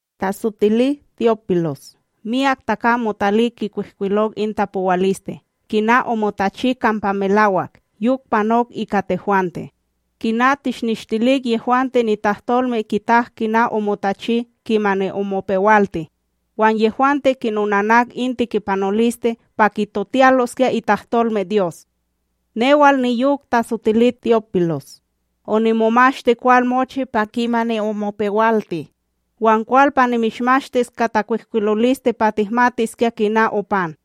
Tasotili Te'ópilos, myak takam motalik kwihkwilok in tapowaliste kina omotachi kampa melawak yok panok ika tehwante, kina tishnishtilik yehwante nitahtolme kitak kina omotachi kimani omopewalti, wan yehwante kinonanak in tikipanoliste pa kitotiyaloskya nitahtolmeDyos. Newal niyok tasotili Te'ópilos, onimomashti kwal mochi pa kimani omopewalti, wan kwal pa nimishmashtis ka takwihkwiloliste pa tihmatiskya kina opan,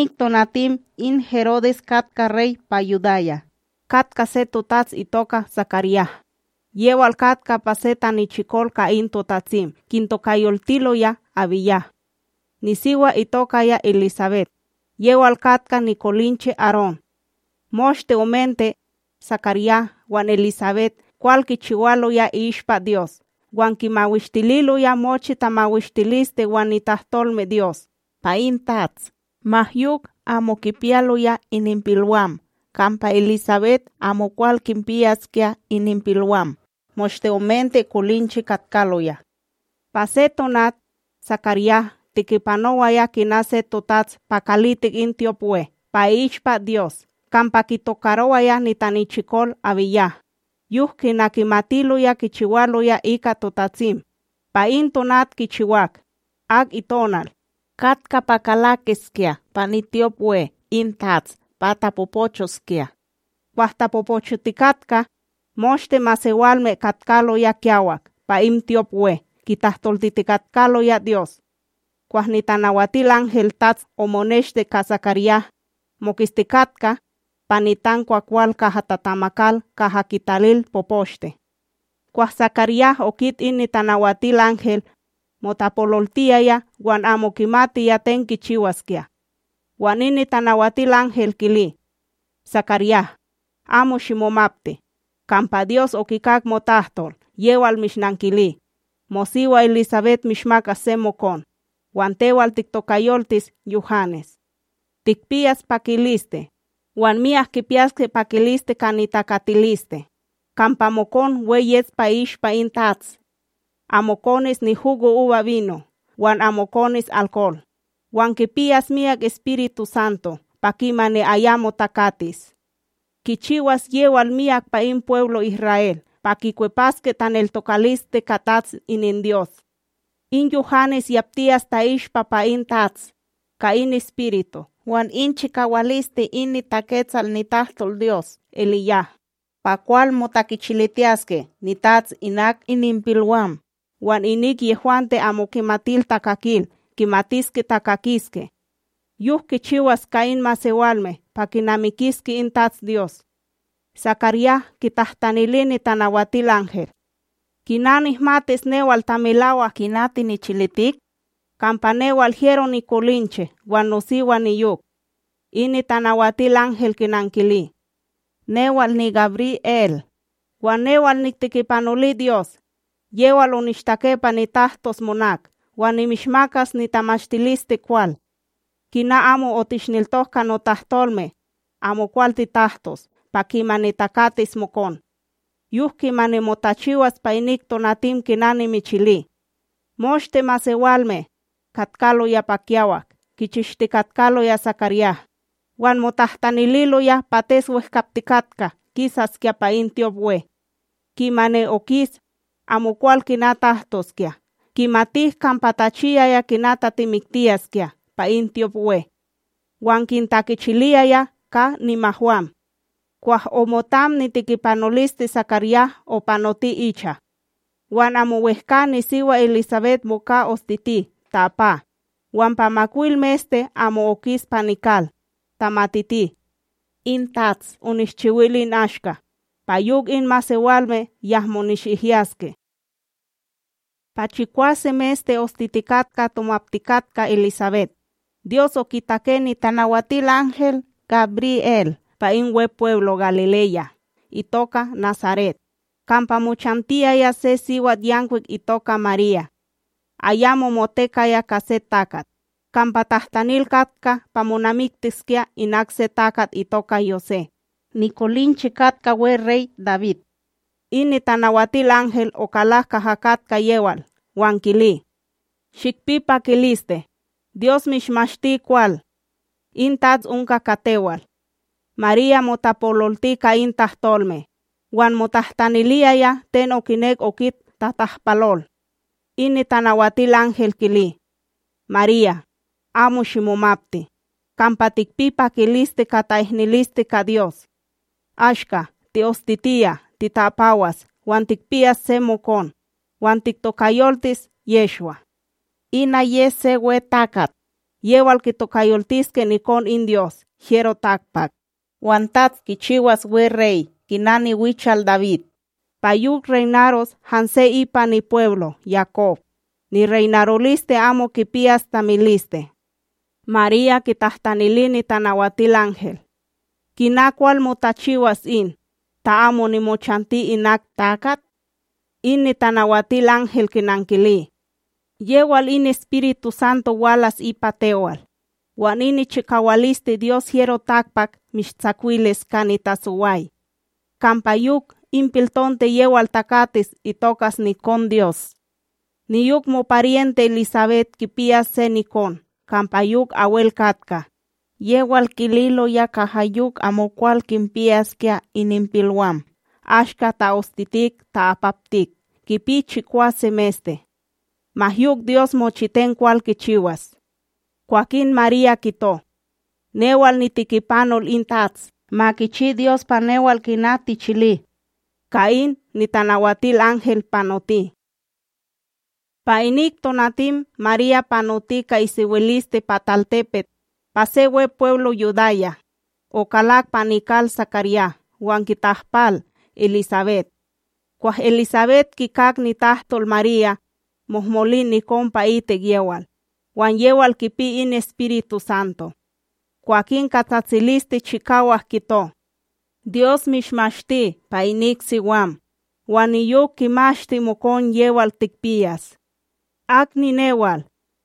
Pa inik tonatim in Herodes katka Rey pa Yudaya, katka se totats itoka SakarYah, yewal katka pa se tanichikol ka in totatsim kintokayoltiloya AbíYah. Nisiwa itokaya EliSabet, yewal katka nikolinche Arón. Moshte omente, SakarYah wan EliSabet kwal kichiwaloya i'ishpa Dyos wan kimawishtililoya mochi tamawishtiliste wan nitahtolmeDyos pa in TATS. Ma yok, amo kipiyaloya ininpilwam, kampa EliSabet amokwal kinpiyaskya ininpilwam, moshte omente kolinche katkaloya. Pa se tonat, SakarYah tikipanowaya kina se totats pa kalitik in tyopWe pa i'ishpa Dyos kampa kitokarowaya nitanichikol AbíYah, yok kina kimatiloya kichiwaloya ika totatsim, pa in tonat kichiwak, ak itonal, katka pa kalakiskya pa nityopWe in TATS pa tapopochoskya. Kwah tapopochotikatka, moshte masewalme katkaloya kiyawak pa in tyopWe kitahtoltitikatkaloya Dyos. Kwah NitanawatilanhelTATS omoneshti ka SakarYah, moketstikatka pa nitankwakwal, kaha tatamakal kaha kitalil poposhte. Kwah SakarYah okit in Nitanawatilanhel, motapololtiyaya wan amo kimatiya ten kichiwaskya. Wan in Nitanawatilanhel kili: ―SakarYah, amo shimomapti, kampa Dyos okikak motahtol yewal mishnankili, mosiwa EliSabet mishmakas se mokon, wan tewal tiktokayoltis Yuhanes. Tikpiyas pakiliste, wan myak kipiyaske pakiliste ka nitakatiliste; kampa mokon we yes pa i'ishpa in TATS. Amo konis nihugoUbaBino wan amo konis alkol, wan kipiyas miyak EspirituSanto pa kimani ayamo takatis. Kichiwas yewal myak pa in pweblo Isra'El pa kikwepaske taneltokaliste ka TATS ininDyos. In Yuhanes yaptiyas ta'ishpa pa in TATS, ka in Espiritu wan in nichikawaliste in niTaketsal nitahtolDyos EliYah, pa kwal motakichilitiyaske nitats inak ininpilwam, wan inik yehwante amo kimatil takakil kimatiske takakiske. Yok kichiwas ka in masewalme pa kinamikiske in TatsDyos. SakarYah kitahtanili Nitanawatilanhel: ―Kina nihmatis newal ta melawak kina tinichilitik? Kampa newal hyero nikolinche wan nosiwa niyok. In Nitanawatilanhel kinankili: ―Newal niGabriEl, wan newal niktikipanoli Dyos; yewal onishtake pa nitahtos monak wan nimishmakas nitamashtilisteKwal. Kina amo otishneltok ka notahtolme, amokwal titahtos pa kimani takatis mokon. Yok kimani motachiwas pa inik tonatim kina nimichili. Moshte masewalme, katkaloya pa kiyawak kichishtikatkaloya SakarYah, wan motahtanililoya pates wehkaptikatka kisaskya pa in tyopWe. Kimani okis, amokwal kina tahtoskya; kimatik kampa tachiyaya kina tatimiktiyaskya pa in tyopWe. Wan kintakichiliyaya ka nimahwam. Kwah omotam nitikipanoliste SakarYah opanoti icha. Wan amo wehkA, nisiwa EliSabet moka ostiti ta'apa, wan pa makwil meste amo okis pa nikal, tamatiti: “In TATS onishchiwil in ashka, pa yok in masewalme yahmo nishihyaske.” Pa chikwase meste ostitikatka tomaptikatka EliSabet, Dyos okitake Nitanawatilanhel GabriEl pa in Wepweblo Galileya itoka Nasaret, kampa mochantiyaya se siwatYankwik itoka Marya. Ayamo motekaya ka se takat, kampa tatahtanil katka pa monamiktiskya inak se takat itoka Yosé, nikolinche katka weRey Dawid. In Nitanawatilanhel okalak kaha katka yewal wan kili: ―Shikpi pakiliste, Dyos mishmashti kwal! In TATS onka ka tewal. Marya motapololti ka in tahtolme, wan motahtaniliyaya ten okinek okit tatahpalol. In Nitanawatilanhel kili: ―Marya, amo shimomapti, kampa tikpi pakiliste ka ta'ihniliste ka Dyos. Ashka, ti'ostitiya tita'apawas wan tikpiyas se mokon, wan tiktokayoltis Yehshwa. Ina yes se we takat; yewal kitokayoltiske Nikon in Dyos HyeroTakpak, wan TATS kichiwas weRey kina niwichal Dawid, pa yok reynaros hanse ipa nipweblo Yakob; nireynaroliste amo kipiyas tamiliste. Marya kitahtanili Nitanawatilanhel: ―Kina kwal motachiwas in, ta amo nimochanti inak takat? In Nitanawatilanhel kinankili: ―Yewal in EspirituSanto walas ipa tewal, wan in nichikawaliste Dyos HyeroTakpak mishtsakwilis ka nitasoway. Kampa yok, in piltonte yewal takatis itokas NikonDyos. Niyok moparyente EliSabet kipiyas se nikon kampa yok abwel katka; yewal kililoya kaha yok amokwal kinpiyaskya ininpilwam ashka ta'ostitik ta'apaptik kipi chikwase meste. Ma yok Dyos mochiten kwal kichiwas. Kwakin Marya kito: ―Newal nitikipanol in TATS; ma kichi Dyos pa newal kina tichili. Ka in, Nitanawatilanhel panoti. Pa inik tonatim Marya panoti ka isewiliste pa talTepet, pa se Wepweblo Yudaya, okalak pa nikal SakarYah wan kitahpal EliSabet. Kwah EliSabet kikak nitahtol Marya, mohmolin nikon pa'itik yewal, wan yewal kipi in EspirituSanto. Kwakin ka tsatsiliste chikawak kito: ―Dyos mishmashti pa inik siwam, wan niyok kimashti mokon yewal tikpiyas. Ak ninewal,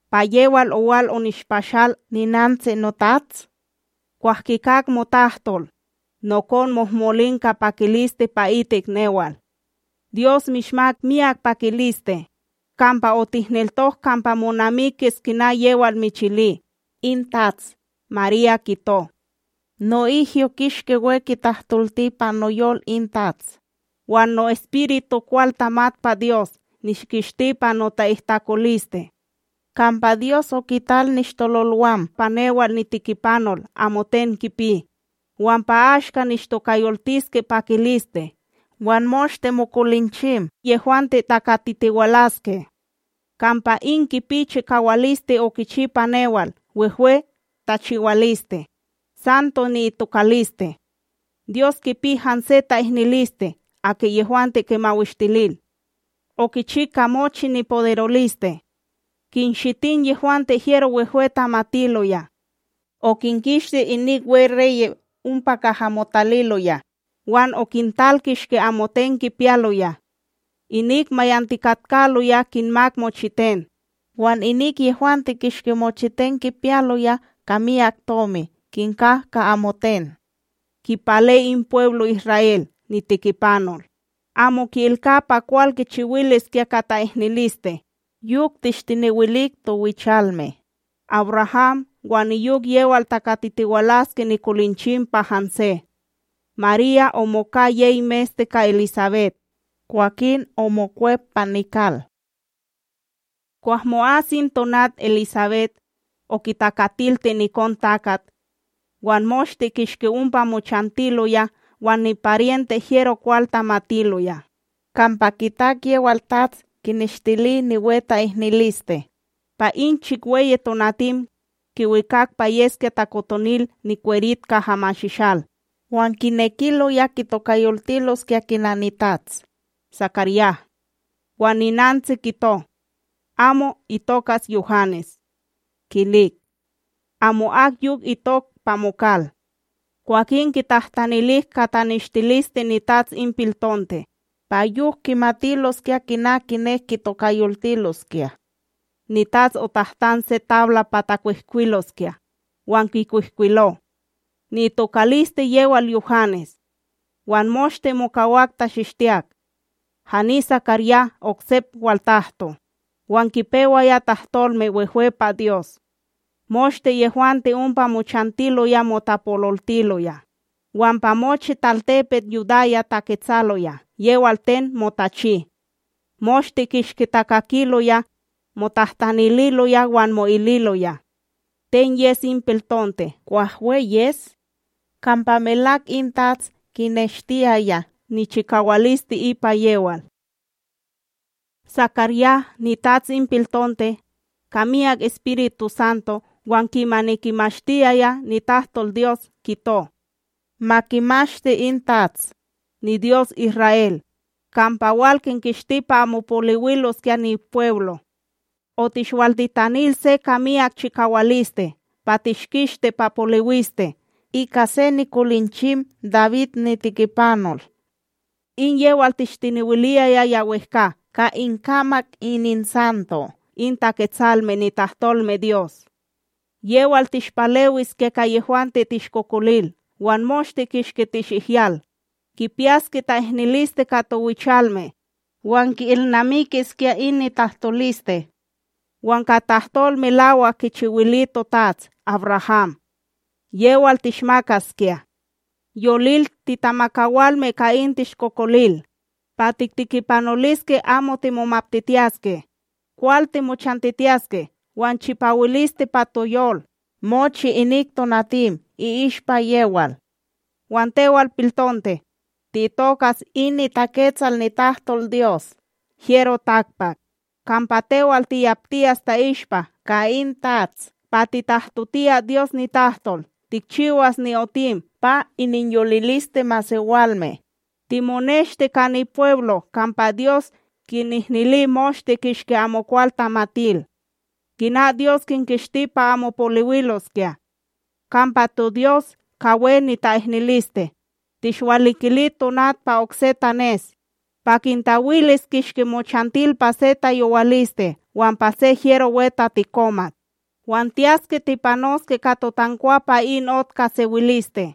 pa yewal owal onishpashal ninantsi noTATS? Kwah kikak motahtol, nokon mohmolin ka pakiliste pa itik newal. Dyos mishmak miyak pakiliste, kampa otihneltok kampa monamikis kina yewal michili in TATS. Marya kito: No'ihyo kishki we kitahtolti pa noyol in TATS, wan no'espiritu kwal tamat pa Dyos nishkishti pa nota'ihtakoliste. Kampa Dyos okital nishtololwam pa newal nitikipanol amoten kipi, wan pa ashka nishtokayoltiske pakiliste wan moshte mokolinchim yehwante takatitiwalaske. Kampa in kipi chikawaliste okichi pa newal wehwe tachiwaliste; Santo ni'itokaliste. Dyos kipi hanse ta'ihniliste aki yehwante kimawishtilil. Okichi ka mochi nipoderoliste; kinshitin yehwante hyero wehwe tamatiloya. Okinkishti inik weReye' ompa kaha motaliloya, wan okintal kishki amoten kipiyaloya. Inik mayantikatkaloya kinmak mochiten, wan inik yehwante kishki mochiten kipiyaloya ka miyak tomi kinka ka amoten. Kipale in pweblo Isra'El nitikipanol; amo ki'ilka pa kwal kichiwiliskya ka ta'ihniliste, yok tishtenewilik towichalme, AbRaham wan niyok yewal takatitiwalaske nikolinchim pa hanse. Marya omoka yey meste ka EliSabet, kwakin omokwep pa nikal. Kwah mo'as in tonat EliSabet, okitakatilti nikonTakat. Wan moshte kishki ompa mochantiloya wan niparyente hyero kwal tamatiloya, kampa kitak yewal TATS kineshtili niwe ta'ihniliste. Pa in chikweyi tonatim, kiwikak pa yeskya takotonil nikwerit kaha mashishal, wan kinekiloya kitokayoltiloskya kina nitats, SakarYah. Wan ninantsi kito: ―Amo. Itokas Yuhanes. Kilik: ―Amo'ak yok itok pa mokal. Kwakin kitahtanilik ka taneshtiliste nitats in piltonte, pa yok kimatiloskya kina kinek kitokayoltiloskya. Nitats otahtan se tabla pa takwihkwiloskya, wan kikwihkwilo: “Ni'itokaliste yewal Yuhanes.” Wan moshte mokawak tachistiyak. Hani SakarYah oksep waltahto, wan kipewaya tahtolme wehwe pa Dyos. Moshte yehwante ompa mochantiloya motapololtiloya, wan pa mochi talTepet Yudaya taketsaloya yewal ten motachi. Moshte kishki takakiloya, motahtanililoya wan mo'ililoya: ―Ten yes in piltonte kwah we yes? Kampa melak in TATS kineshtiyaya nichikawaliste ipa yewal. SakarYah nitats in piltonte, ka miyak EspirituSanto wan kimani kimashtiyaya nitahtolDyos kito: Ma kimashti in TATS, niDyos Isra'El, kampa wal kinkishti pa amo poliwiloskya pa nipweblo. Otishwaltitanil se ka miyak chikawaliste pa tishkishti pa poliwiste ika se nikolinchim Dawid nitikipanol. In yewal tishtenewiliyaya ya wehkA ka inkamak ininsanto in Taketsalme nitahtolmeDyos: Yewal tishpalewiskya ka yehwante tishkokolil wan moshte kishki tishihyal, kipiyaskya ta'ihniliste ka towichalme, wan ki'ilnamikiskya in nitahtoliste. Wan ka tahtol melawak kichiwili totats AbRaham: Yewal tishmakaskya. Yolil, titamakawalme ka in tishkokolil, pa tiktikipanoliske amo timomaptitiyaske, kwal timochantitiyaske wan chipawiliste pa toyol, mochi inik tonatim i'ishpa yewal. Wan tewal piltonte, ti'itokas in niTaketsal nitahtolDyos HyeroTakpak, kampa tewal tiyaptiyas ta'ishpa ka in TATS pa titahtotiyas Dyos nitahtol tikchiwas ni'otim pa ininyoliliste masewalme, timoneshti ka nipweblo kampa Dyos kinihnili moshte kishki amokwal tamatil, kina Dyos kinkishti pa amo poliwiloskya. Kampa toDyos, ka we nita'ihniliste, tishwalikili tonat pa okse tanes, pa kintawilis kishki mochantil pa se tayowaliste wan pa se hyero we tatikomat, wan tiyaske tipanoske ka totankwa pa in ot ka sewiliste.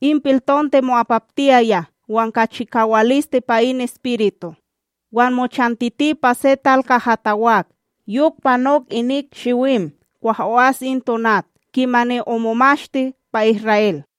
In piltonte mo'apaptiyaya wan ka chikawaliste pa in espiritu, wan mochantiti pa se tal kaha tawak yok panok inik shiwim kwah o'as in tonat kimani omomashti pa Isra'El.